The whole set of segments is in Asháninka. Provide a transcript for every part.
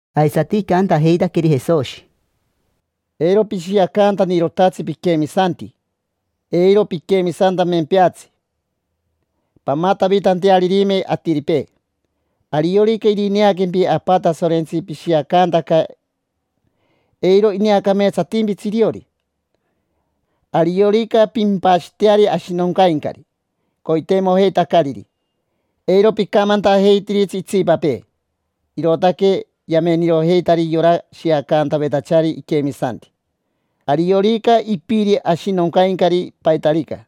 Aisati icantajeitaqueri Jesoshi: —Eiro pishiacantanirotatsi piquemisanti, eiro piquemisantamempeatsi pamatavitantearirime atiripee. Ariorica irineaquempi Apa Tasorentsi pishiacantaca, eiro ineacameetsatimpitsi iriori. Ariorica pimpashiteari ashinoncaincari coiteimojeitacariri, eiro picamantajeitiritsi itsipapee. Irootaque yamenirojeitari yora shiacantavetachari iquemisanti. Ariorica ipiri ashinoncaincari paitarica,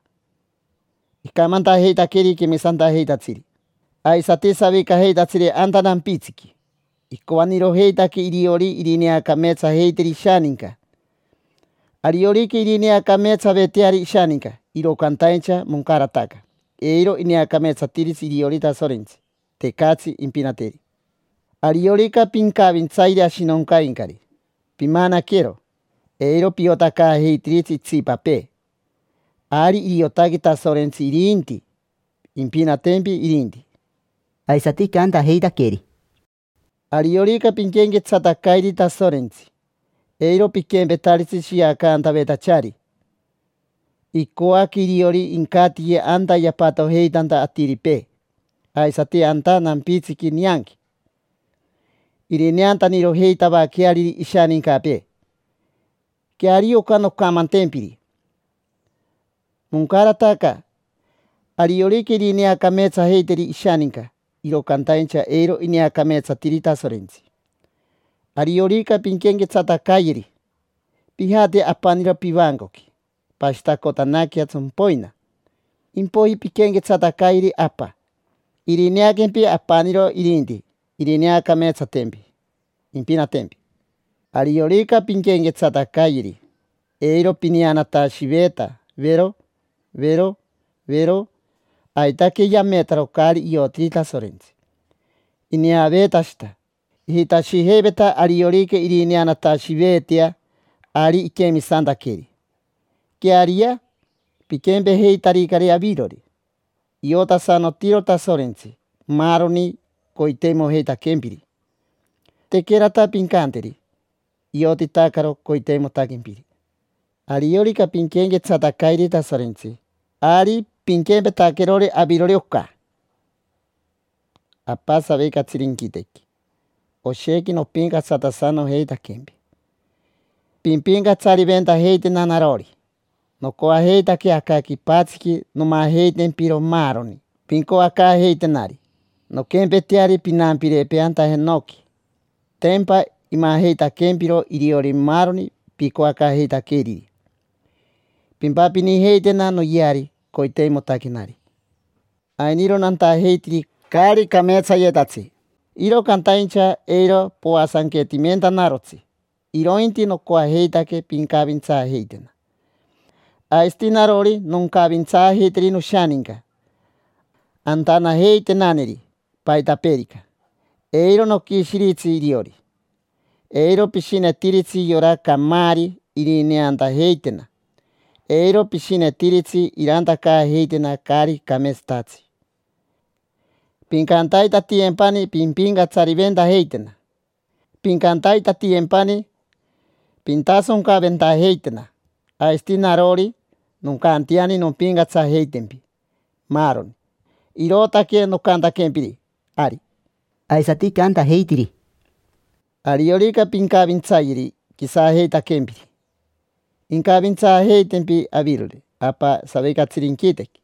icamantajeitaqueri quemisantajeitatsiri, aisati savicajeitatsiri anta nampitsiqui. Icoanirojeitaque iriori irineacameetsajeiteri ishaninca. Ariorica irineacameetsaveteari ishaninca, iro cantaincha moncarataca: eiro ineacameetsatiritsi iriori Tasorentsi, tecatsi impinateri. Ariorica pincavintsayeri ashinoncaincari, pimanaquero: eiro piotacaajeitiritsi itsipapee. Ari iriotaque Tasorentsi irinti, impinatempi irinti. Aisati icantajeitaqueri: —Ariorica pinquenquetsatacayeri Tasorentsi, eiro piquempetaritsi shiacantavetachari: icoaque iriori incatiye anta yapatojeitanta atiripee, aisati anta nampitsiqui nianqui, irineantanirojeitavaqueariri ishanincapee. Queario oca noncamantempiri: moncarataca. Ariorica irineacameetsajeiteri ishaninca, iro cantaincha eiro ineacameetsatiritsi Tasorentsi. Ariorica pinquenquetsatacayeri, pijate apaniro pivancoqui, pashitacotanaquea tsompoina, impoiji pinquenquetsatacayeri Apa. Irineaquempi apaniro irinti, irineacameetsatempi, impinatempi. Ariorica pinquenquetsatacayeri, eiro pineanatashiveeta, vero, vero, vero. Aitaque yametaro caari iotiri Tasorentsi, ineaveetashita. Ijitashijeiveta ariorica irineanatashiveetea, ari inquemisantaqueri. Queariyea, piquempejeitaricari avirori. Iotasanotiro Tasorentsi maaroni coiteimojeitaquempiri. Tequerata pincanteri, iotitacaro coiteimotaquempiri. Ariorica pinquenquetsatacayeri Tasorentsi, ari pinquempetaquerori avirori oca: Apa, savicatsiri inquitequi, oshequi nopincatsatasanojeitaquempi. Pimpincatsariventajeitena narori. Nocoajeitaque aca quipatsiqui nomajeitempiro maaroni pincoacaajeitenari, nonquempeteari pinampirepee anta jenoqui: tempa imajeitaquempiro iriori maaroni picoacaajeitaqueriri. Pimpapinijeitena noyeari coiteimotaquenari. Ainiro nantajeitiri caari cameetsayetatsi, iro cantaincha eiro poasanquetimentanarotsi, irointi nocoajeitaque pincavintsaajeitena. Aisati narori noncavintsaajeiteri noshaninca antanajeitenaneri paitapeerica, eiro noquishiritsi iriori. Eiro pishinetiritsi yora camaari irineantajeitena, eiro pishinetiritsi irantacaajeitena caari cameetsatatsi. Pincantaitatiyempani pimpincatsariventajeitena. Pincantaitatiyempani pintasoncaventajeitena. Aisati narori, noncanteani nompincatsajeitempi, maaroni. Irootaque nocantaquempiri, ari. Aisati icantajeitiri: —Ariorica pincavintsayeri quisajeitaquempiri, incavintsaajeitempi avirori Apa savicatsiri inquitequi.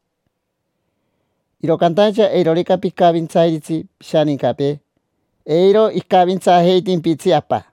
Iro cantaincha eirorica picavintsairitsi pishanincapee, eiro icavintsaajeitimpitsi Apa.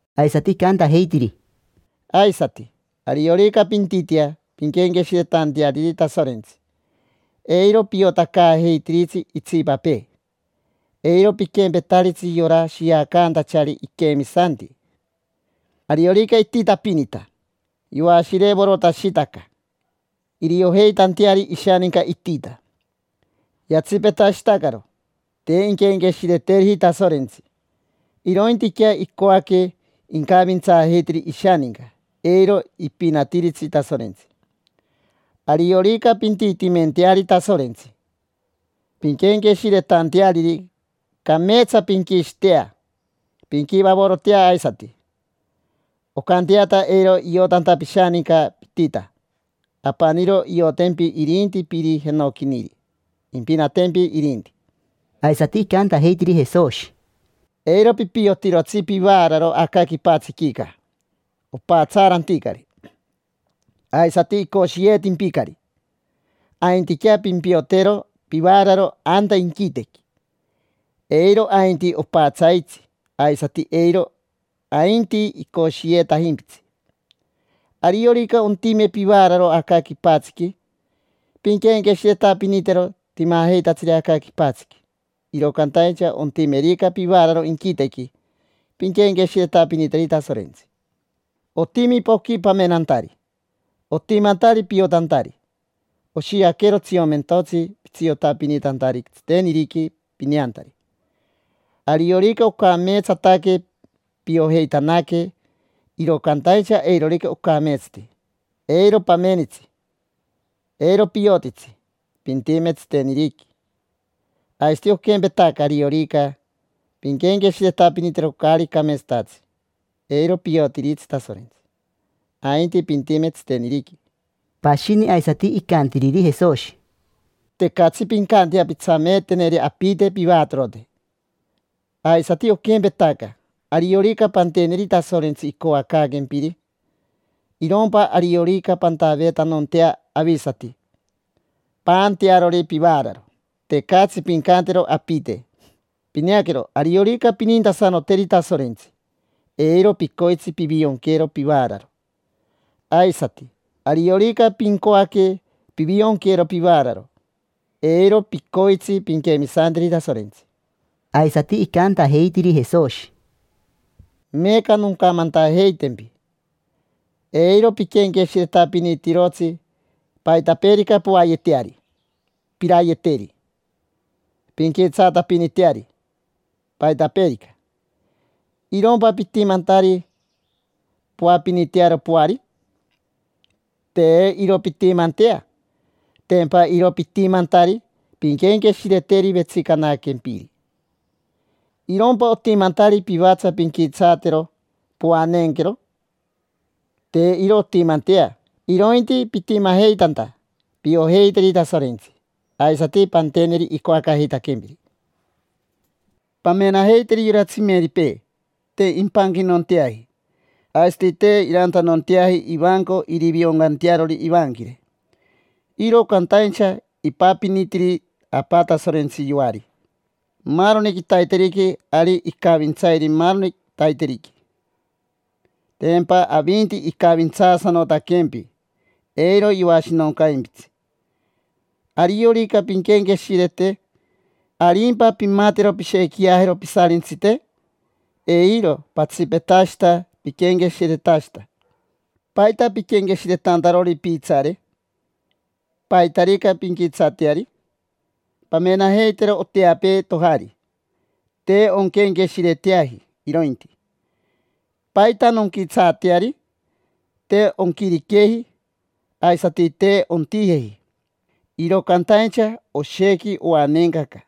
Aisati icantajeitiri: —Aisati, ariorica pintitea pinquenqueshiretanteariri Tasorentsi, eiro piotacaajeitiritsi itsipapee. Eiro piquempetaritsi yora shiacantachari iquemisanti: ariorica ititapinita, yoashirevorotashitaca iriojeitanteari ishaninca itita. Yatsipetashitacaro, te inquenqueshireteriji Tasorentsi, irointiquea icoaque incavintsaajeiteri ishaninca. Eiro ipinatiritsi Tasorentsi. Ariorica pintitimenteari Tasorentsi pinquenqueshiretanteariri, cameetsa pinquishitea, pinquivavorotea aisati, oncanteata eiro iotanta pishaninca pitita. Apaniro iriotempi irinti Piri jenoquiniri, impinatempi irinti. Aisati icantajeitiri Jesoshi: —Eiro pipiotirotsi pivaararo aca quipatsiquica: opatsaaranticari, aisati icoshiyeetimpicari. Aintiquea pimpiotero pivaararo anta inquitequi: eiro ainti opatsaitsi, aisati eiro ainti icoshiyeetajimpitsi. Ariorica ontime pivaararo aca quipatsiqui, pinquenqueshiretapinitero timajeitatsiri aca quipatsiqui; iro cantaincha ontimerica pivaararo inquitequi, pinquenqueshiretapiniteri Tasorentsi. Otimi poqui pamenantari, otimantari piotantari. Oshiaquero tsiomentotsi pitsiotapinitantari tsiteniriqui pineantari. Ariorica ocameetsataque, piojeitanaque, iro cantaincha eirorica ocameetsati, eiro pamenitsi, eiro piotitsi, pintime tsiteniriqui. Aisati oquempetaca, ariorica pinquenqueshiretapinitero caari cameetsatatsi, eiro piotiritsi Tasorentsi, ainti pintime tsiteniriqui. Pashini aisati icantiriri Jesoshi: —Tecatsi pincantea pintsameeteneri apite pivatorote, aisati oquempetaca: ariorica panteneri Tasorentsi icoacaaquempiri, irompa ariorica pantaveetanontea avisati paantearori pivaararo. Tecatsi pincantero apite. Pineaquero, ariorica pinintasanoteri Tasorentsi, eiro picoitsi pivionquero pivaararo. Aisati, ariorica pincoaque pivionquero pivaararo, eiro picoitsi pinquemisanteri Tasorentsi. Aisati icantajeitiri Jesoshi: —Meeca noncamantajeitempi: eiro piquenqueshiretapinitirotsi paitapeerica poayeteari, pirayeteri, pinquitsaatapiniteari, paitapeerica. ¿Irompa pitimantari poapinitearo poari? Te iro pintimantea, tempa iro pitimantari pinquenqueshireteri vetsicanaquempiri. ¿Irompa otimantari pivatsa pinquitsaatero, poaneenquero? Te iro ontimantea. Irointi pitimajeitanta piojeiteri Tasorentsi, aisati panteneri icoacaajeitaquempiri. Pamenajeiteri yora tsimeripee: te impanquitanonteaji, aisati te irantanonteaji ivanco irivioncantearori ivanquire. Iro cantaincha ipapinitiri Apa Tasorentsi yoari maaroni quitaiteriqui. Ari icavintsairi maaroni quitaiteriqui; tempa avinti icavintsaasanotaquempi, eiro yoashinoncaimpitsi. Ariorica pinquenqueshirete, ¿arimpa pimatero pishequiajero pisarintsite? Eiro. Patsipetashita piquenqueshiretashita. ¿Paita piquenqueshiretantarori piitsaare, paitarica pinquitsaateari? Pamenajeitero oteapee tojari, te onquenqueshireteaji irointi: “¿Paita nonquitsaateari?” Te onquiriqueji, aisati te ontijeji, iro cantaincha, oshequi oaneencaca.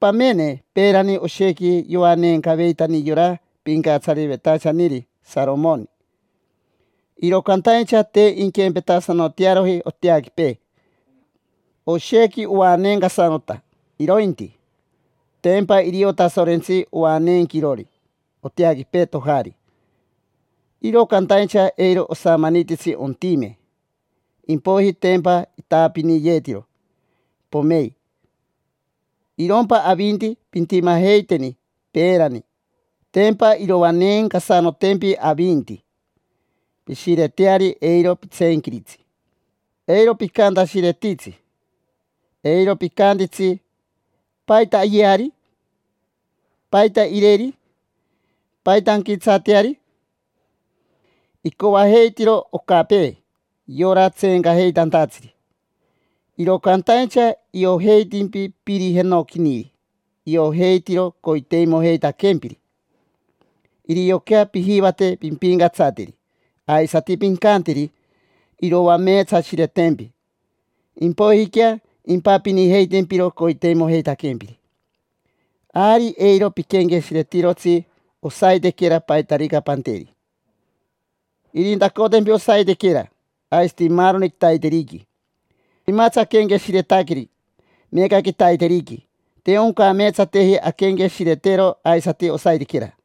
Pamene, peerani oshequi yoaneencaveitani yora pincatsariveitachaniri Saromoni, iro cantaincha te inquempetasanotearoji oteaquipee: oshequi oaneencasanota irointi. Tempa irio Tasorentsi oaneenquirori oteaquipee tojari, iro cantaincha eiro osamanititsi ontime, impoiji tempa itaapiniyeetiro, pomei. Irompa avinti, pintimajeiteni peerani: tempa iroaneencasanotempi avinti. Pishireteari, eiro pitseenquiritsi. Eiro picantashiretitsi, eiro picantitsi: “¿Paita ayeari? ¿Paita ireri? ¿Paita anquitsaateari?” Icoajeitiro ocapee yora tseencajeitantatsiri. Iro cantaincha iojeitimpi Piri jenoquiniri, iojeitiro coiteimojeitaquempiri. Irioquea pijivate pimpincatsateri, aisati pincanteri iroameetsashiretempi, impoijiquea impapinijeitempiro coiteimojeitaquempiri. Ari eiro piquenqueshiretirotsi osaitequera, paitarica panteri. Irintacotempi osaitequera, aisati maaroni quitaiteriqui. Timatsi aquenqueshiretaqueri meeca quitaiteriqui, te oncameetsateji anquenqueshiretero aisati osaitequera.